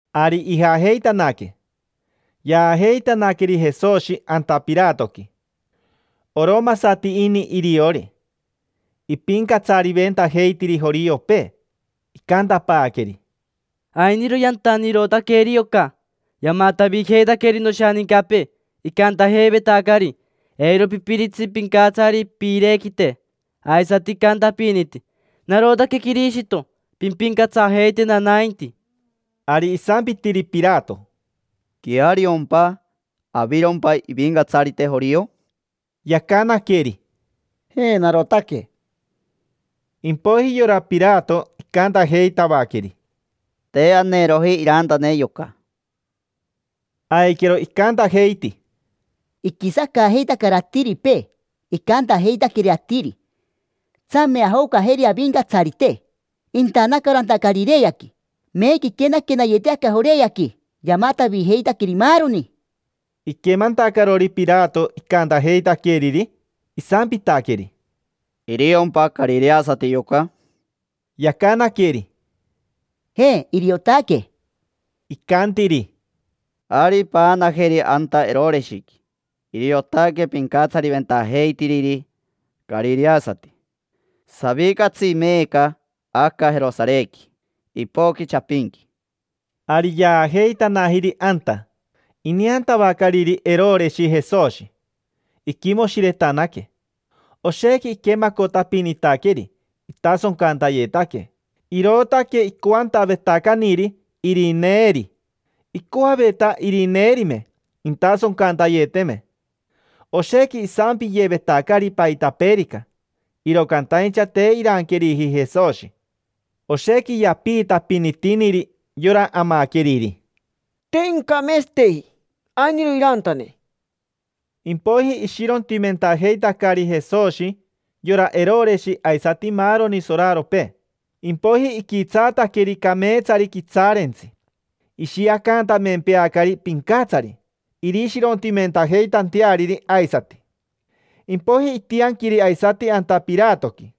Ari ijajeitanaque, yaajeitanaqueri Jesoshi anta Piratoqui. Oromasati ini iriori, ipincatsariventajeitiri joriopee. Icantapaaqueri: —Ainiro yantanirotaqueri yoca. Yamatavijeitaqueri noshanincapee, icantajeivetacari: “Eiro pipiritsi pincatsari piirequite”. Aisati icantapiniti: “Narotaque Quirishito, pimpincatsajeitena nainti”. Ari isampitiri Pirato: —¿Queariompa? ¿Avirompa ivicatsarite jorio? Yacanaqueri: —Je, narotaque. Impoiji yora Pirato icantajeitavaqueri: —Te aneroji irantane yoca. Aiquero icantajeiti: —Iquisacaajeitacari atiripee, icantajeitaqueri atiri: “Tsame ajocajeri avincatsarite”. Intanacaro anta Carireaqui, meeca iquenaquenayeti aca Joreaqui, yamatavijeitaqueri maaroni. Iquemantacarori Pirato icantajeitaqueriri, isampitaqueri: —¿Iriompa carireasati yoca? Yacanaqueri: —Je, iriotaque. Icantiri: —Ari, paanajeri anta Eroreshiqui. Iriotaque pincatsariventajeitiriri carireasati. Savicatsi meeca aca Jerosarequi. Ipoqui chapinqui. Ari yaajeitanajiri anta. Ineantavacariri Eroreshi Jesoshi, iquimoshiretanaque. Oshequi iquemacotapinitaqueri, itasoncantayetaque, irootaque icoantavetacaniri irineeri. Icoaveta irineerime intasoncantayeteme. Oshequi isampiyevetacari paitapeerica, iro cantaincha te iranqueriji Jesoshi. Oshequi yapiitapinitiniri yora amaqueriri: —Te incameetsateji. Ainiro irantane. Impoiji ishirontimentajeitacari Jesoshi yora Eroreshi aisati maaroni soraropee. Impoiji iquitsaataqueri cameetsari quitsaarentsi, ishiacantamempeacari pincatsari, irishirontimentajeitanteariri aisati. Impoiji itianquiri aisati anta Piratoqui.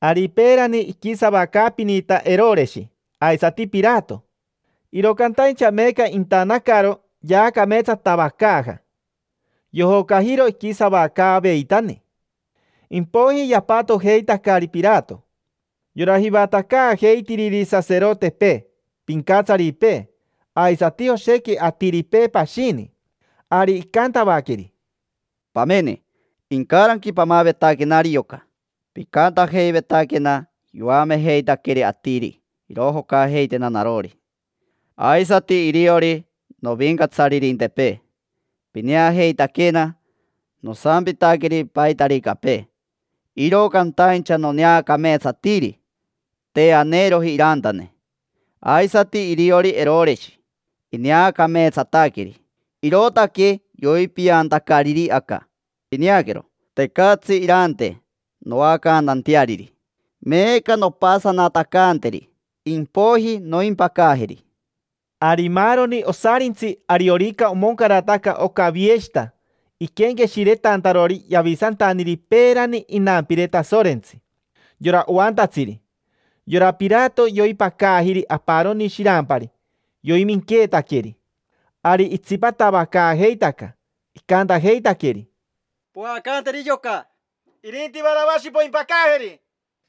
Ari peerani iquisavacaapinita Eroreshi aisati Pirato, iro cantaincha meeca intanacaro yaacameetsatavacaaja. Yojocajiro iquisavacaaveitani. Impoiji yapatojeitacari Pirato yora jivatacaajeitiriri saserotepee, pincatsaripee, aisati oshequi atiripee pashini. Ari icantavaqueri: —Pamene, incaranqui pamavetaquenari yoca, picantajeivetaquena yoamejeitaqueri atiri irojocajeitena narori, aisati iriori novincatsaririntepee. Pineajeitaquena nosampitaqueri paitaricapee, iro cantaincha noneacameetsatiri: te aneeroji irantane. Aisati iriori Eroreshi, ineacameetsataqueri, irootaque yoipiantacariri aca. Pineaquero, tecatsi irante noacantanteariri. Meeca nompasatacanteri, impoiji noimpacajeri. Ari maaroni osarintsi ariorica omoncarataca oca vieshita iquenqueshiretantarori yavisantaniri peerani inampire Tasorentsi, yora oantatsiri, yora Pirato yoipacajiri aparoni shirampari yoiminqueetaqueri. Ari itsipatavacaajeitaca icantajeitaqueri: —Poacanteri yoca, irinti Varavashi poimpacajeri.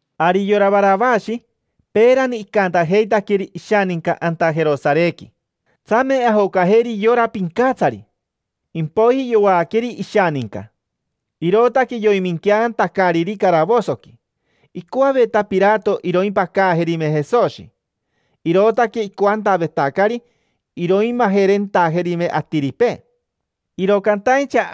Ari yora Varavashi peerani icantajeitaqueri ishaninca anta Jerosarequi: “Tsame ajocajeri yora pincatsari”. Impoiji yoaqueri ishaninca, irootaque yoiminqueantacariri caravosoqui. Icoaveta Pirato iroimpacajerime Jesoshi, irootaque icoantavetacari iroimajerentajerime atiripee, iro cantaincha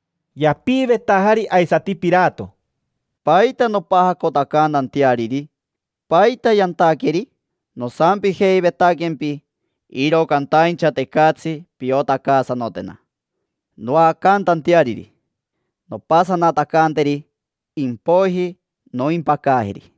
Yapiivetajari aisati Pirato: —¿Paita nompajacotacantanteariri? ¿Paita yantaqueri? Nosampijeivetaquempi, iro cantaincha tecatsi piotacaasanotena noacantanteariri. Nompasanatacanteri, impoiji noimpacajeri.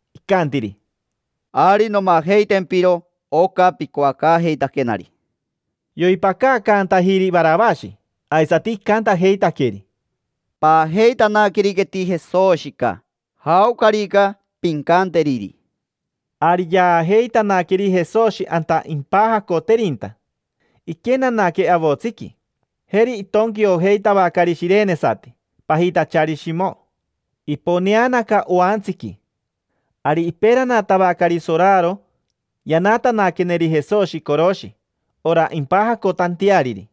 icantiri: —Ari nomajeitempiro oca picoacaajeitaquenari. Yoipacaacantajiri Varavashi, aisati icantajeitaqueri: —Paajeitanaqueriqueti Jesoshica, jaocarica pincanteriri. Ari yaajeitanaqueri Jesoshi anta impajacoterinta, iquenanaque avotsiqui. Jeri itonquiojeitavacari shirenesati pajitachari Shimo. Iponeanaca oantsiqui. Ari iperanatavacari soraro yanatanaqueneri Jesoshi coroshi, ora impajacotanteariri.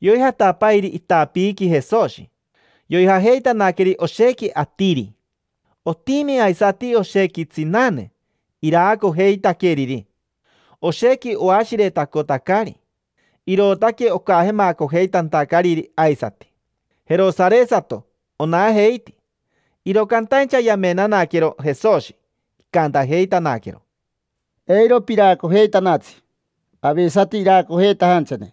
Yoijatapairi itapiiqui Jesoshi. Yoijajeitanaqueri oshequi atiri. Otimi aisati oshequi tsinane iraacojeitaqueriri. Oshequi oashiretacotacari, irootaque ocajemacojeitantacariri aisati. Jerosaresato onajeiti. Iro cantaincha yamenanaquero Jesoshi, icantajeitanaquero: —Eiro piracojeitanatsi, avisati iracojeitajanchane,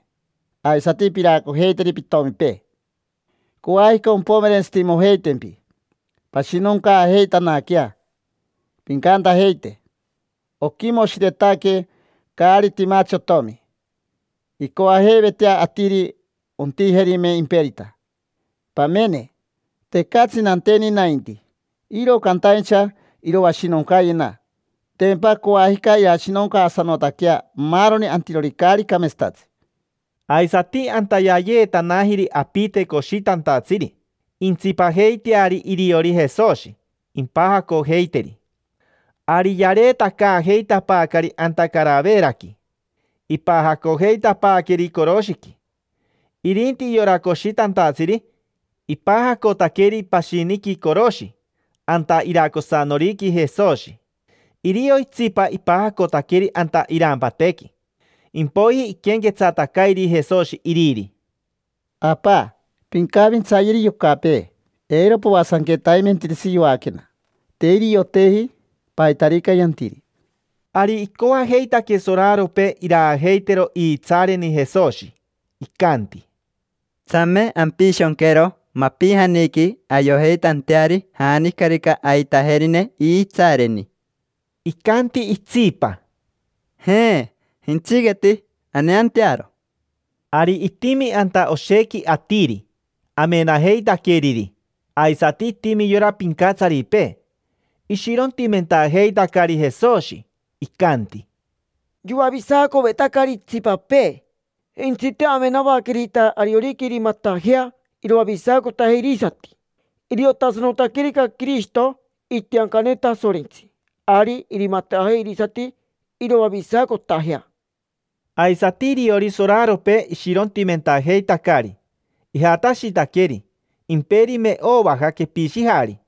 aisati piracojeiteri pitomipee. Coajica ompomerentsitimojeitempi, pashinoncaajeitanaquea. Pincantajeite: “Oquimoshiretaque caari timatsi otomi”. Incoajeivetea atiri ontijerime imperita. Pamene, tecatsi nanteni nainti, iro cantaincha iroashinoncayena. Tempa coajica irashinoncaasanotaquea maaroni antirori caari cameetsatatsi. Aisati anta yaayeetanajiri apite coshitantatsiri, intsipajeiteari iriori Jesoshi, impajacojeiteri. Ari yareetacaajeitapaacari anta Caraveraqui, ipajacojeitapaaqueri coroshiqui, tac, tac, tac. Irinti yora coshitantatsiri, ipajacotaqueri pashiniqui coroshi anta iracosanoriqui Jesoshi. Irio itsipa ipajacotaqueri anta irampatequi. Impoiji iquenquetsatacairi Jesoshi iriri: —Apa, pincavintsayeri yocapee, eiro poasanquetaimentiritsi yoaquena. Te irioteji paitarica yantiri. Ari icoajeitaque soraropee iraajeitero iitsaareni Jesoshi. Icanti: —Tsame ampishonquero mapijaniqui ayojeitanteari janicarica aitajerine iitsaareni. Icanti itsipa: —Jaa, jentsiqueti, aneantearo. Ari itimi anta oshequi atiri, amenajeitaqueriri, aisati itimi yora pincatsaripee, ishirontimentajeitacari Jesoshi, iji, iji, iji; icanti: —Yoavisacovetacari itsipapee, jentsite amenavaquerita ariorica irimatajea iroavisacotajea irisati. Iriotasanotaquerica Quirishito, itiancane Tasorentsi, ari irimatajea irisati iroavisacotajea. Aisati iriori soraropee, ishirontimentajeitacari. Ijatashitaqueri, imperime ovaja, quepishijari.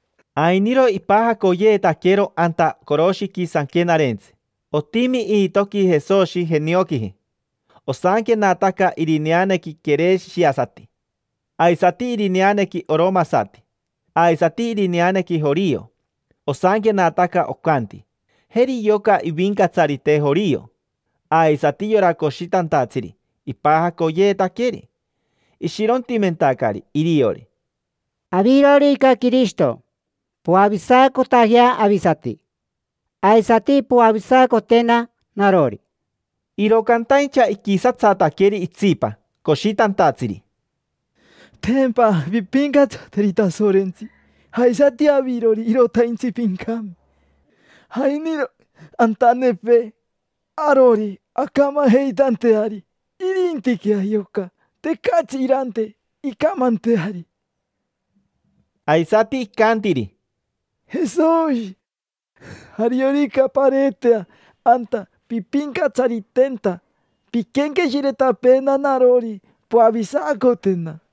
Ainiro ipajacoyeetaquero anta coroshiqui sanquenarentsi, otimi iitoqui Jesoshi, jenioquiji. Osanquenataca irineanequi quereshiasati, aisati irineanequi oromasati, aisati irineanequi jorio. Osanquenataca, ocanti: “Jeri yoca ivincatsarite jorio”. Aisati yora coshitantatsiri ipajacoyeetaqueri, ishirontimentacari iriori. —Avirorica Quirishito, poavisacotajea avisati, aisati poavisacotena narori. Iro cantaincha iquisatsataqueri itsipa coshitantatsiri: —Tempa pimpincatsateri Tasorentsi. Aisati avirori, irotaintsi pincame. Ainiro antanepee arori ancamajeitanteari, irintiquea yoca, tecatsi irante incamanteari. Aisati icantiri: —Jesoshi, ariorica pareetea anta pimpincatsaritenta, pinquenqueshiretapeena narori, poavisacotena.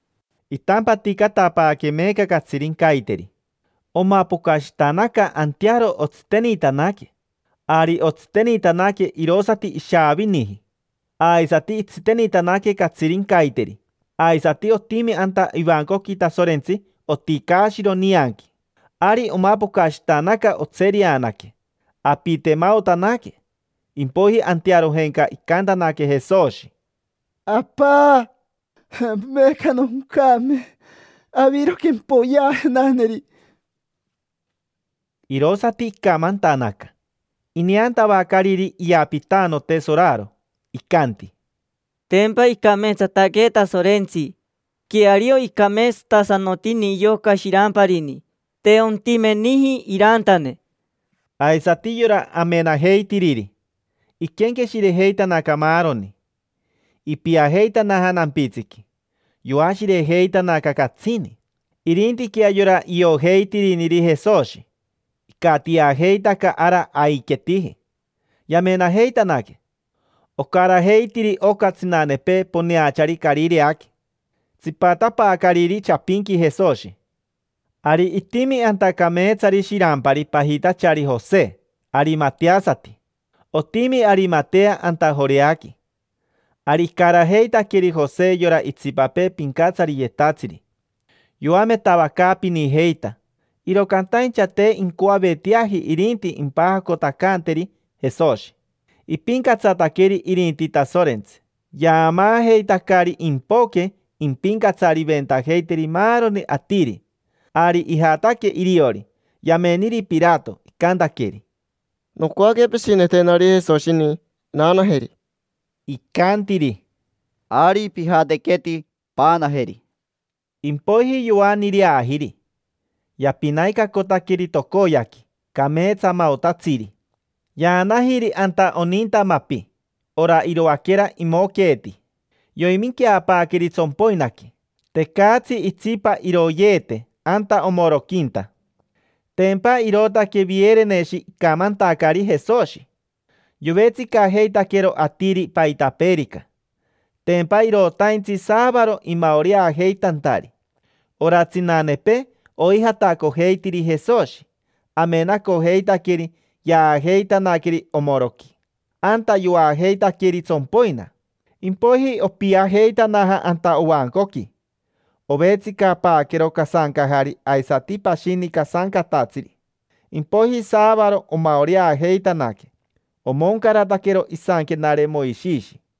Itampaticatapaaque meeca catsirincaiteri. Omapocashitanaca antearo otsitenitanaque. Ari otsitenitanaque irosati ishaaviniji. Aisati itsitenitanaque catsirincaiteri. Aisati otimi anta ivancoqui Tasorentsi oticaashiro nianqui. Ari omapocashitanaca, otsereanaque, tsererere, tsati; apitemaotanaque. Impoiji antearojenca icantanaque Jesoshi: —Apa, meeca noncame. Aviro quempoyeajenaneri. Irosati icamantanaca, toren. Ineantavacariri iyapitanote soraro, icanti: —Tempa icameetsataque Tasorentsi. Queario icameetsatasanotini yoca shiramparini. Te ontimeniji irantane. Aisati yora amenajeitiriri, iquenqueshirejeitanaca maaroni. Ipiajeitanaja nampitsiqui, yoashirejeitanaca catsini. Irintiquea yora iojeitiriniri Jesoshi, icatiajeitaca ara aiquetiji, yamenajeitanaque. Ocarajeitiri oca tsinanepee poneachari Carireaqui, tsipatapaacariri chapinqui Jesoshi. Ari itimi anta cameetsari shirampari, pajitachari Jose, arimateasati. Otimi Arimatea anta Joreaqui. Ari icarajeitaqueri Jose yora itsipapee pincatsariyetatsiri, yoametavacaapinijeita, iro cantaincha te incoaveteaji irinti impajacotacanteri Jesoshi. Ipincatsataqueri irinti Tasorentsi, yaamaajeitacari impoque impincatsariventajeiteri maaroni atiri. Ari ijataque iriori, yameniri Pirato, icantaqueri: —Nocoaque pishinetenari Jesoshini, naanajeri. Icantiri: —Ari, pijatequeti, paanajeri. Impoiji yoaniireajiri, yapinaicacotaqueri tocoyaqui, cameetsamaotatsiri. Yaanajiri anta oninta mapi, ora iroaquera imoqueeti, yominqueapaaqueri tsompoinaqui. Tecatsi itsipa iroyeete anta omoroquinta. Tempa irootaque Viereneshi icamantacari Jesoshi. Yovetsicajeitaquero atiri paitapeerica, tempa irotaintsi saavaro imaoreajeitantari. Ora tsinanepee oijatacojeitiri Jesoshi, amenacojeitaqueri yaajeitanaqueri omoroqui, anta yoajeitaqueri tsompoina. Impoiji opiajeitanaja anta ovancoqui. Ovetsicapaaquero casancajari aisati pashini casancatatsiri. Impoiji saavaro omaoreajeitanaque, omoncarataquero isanquenare Moishishi.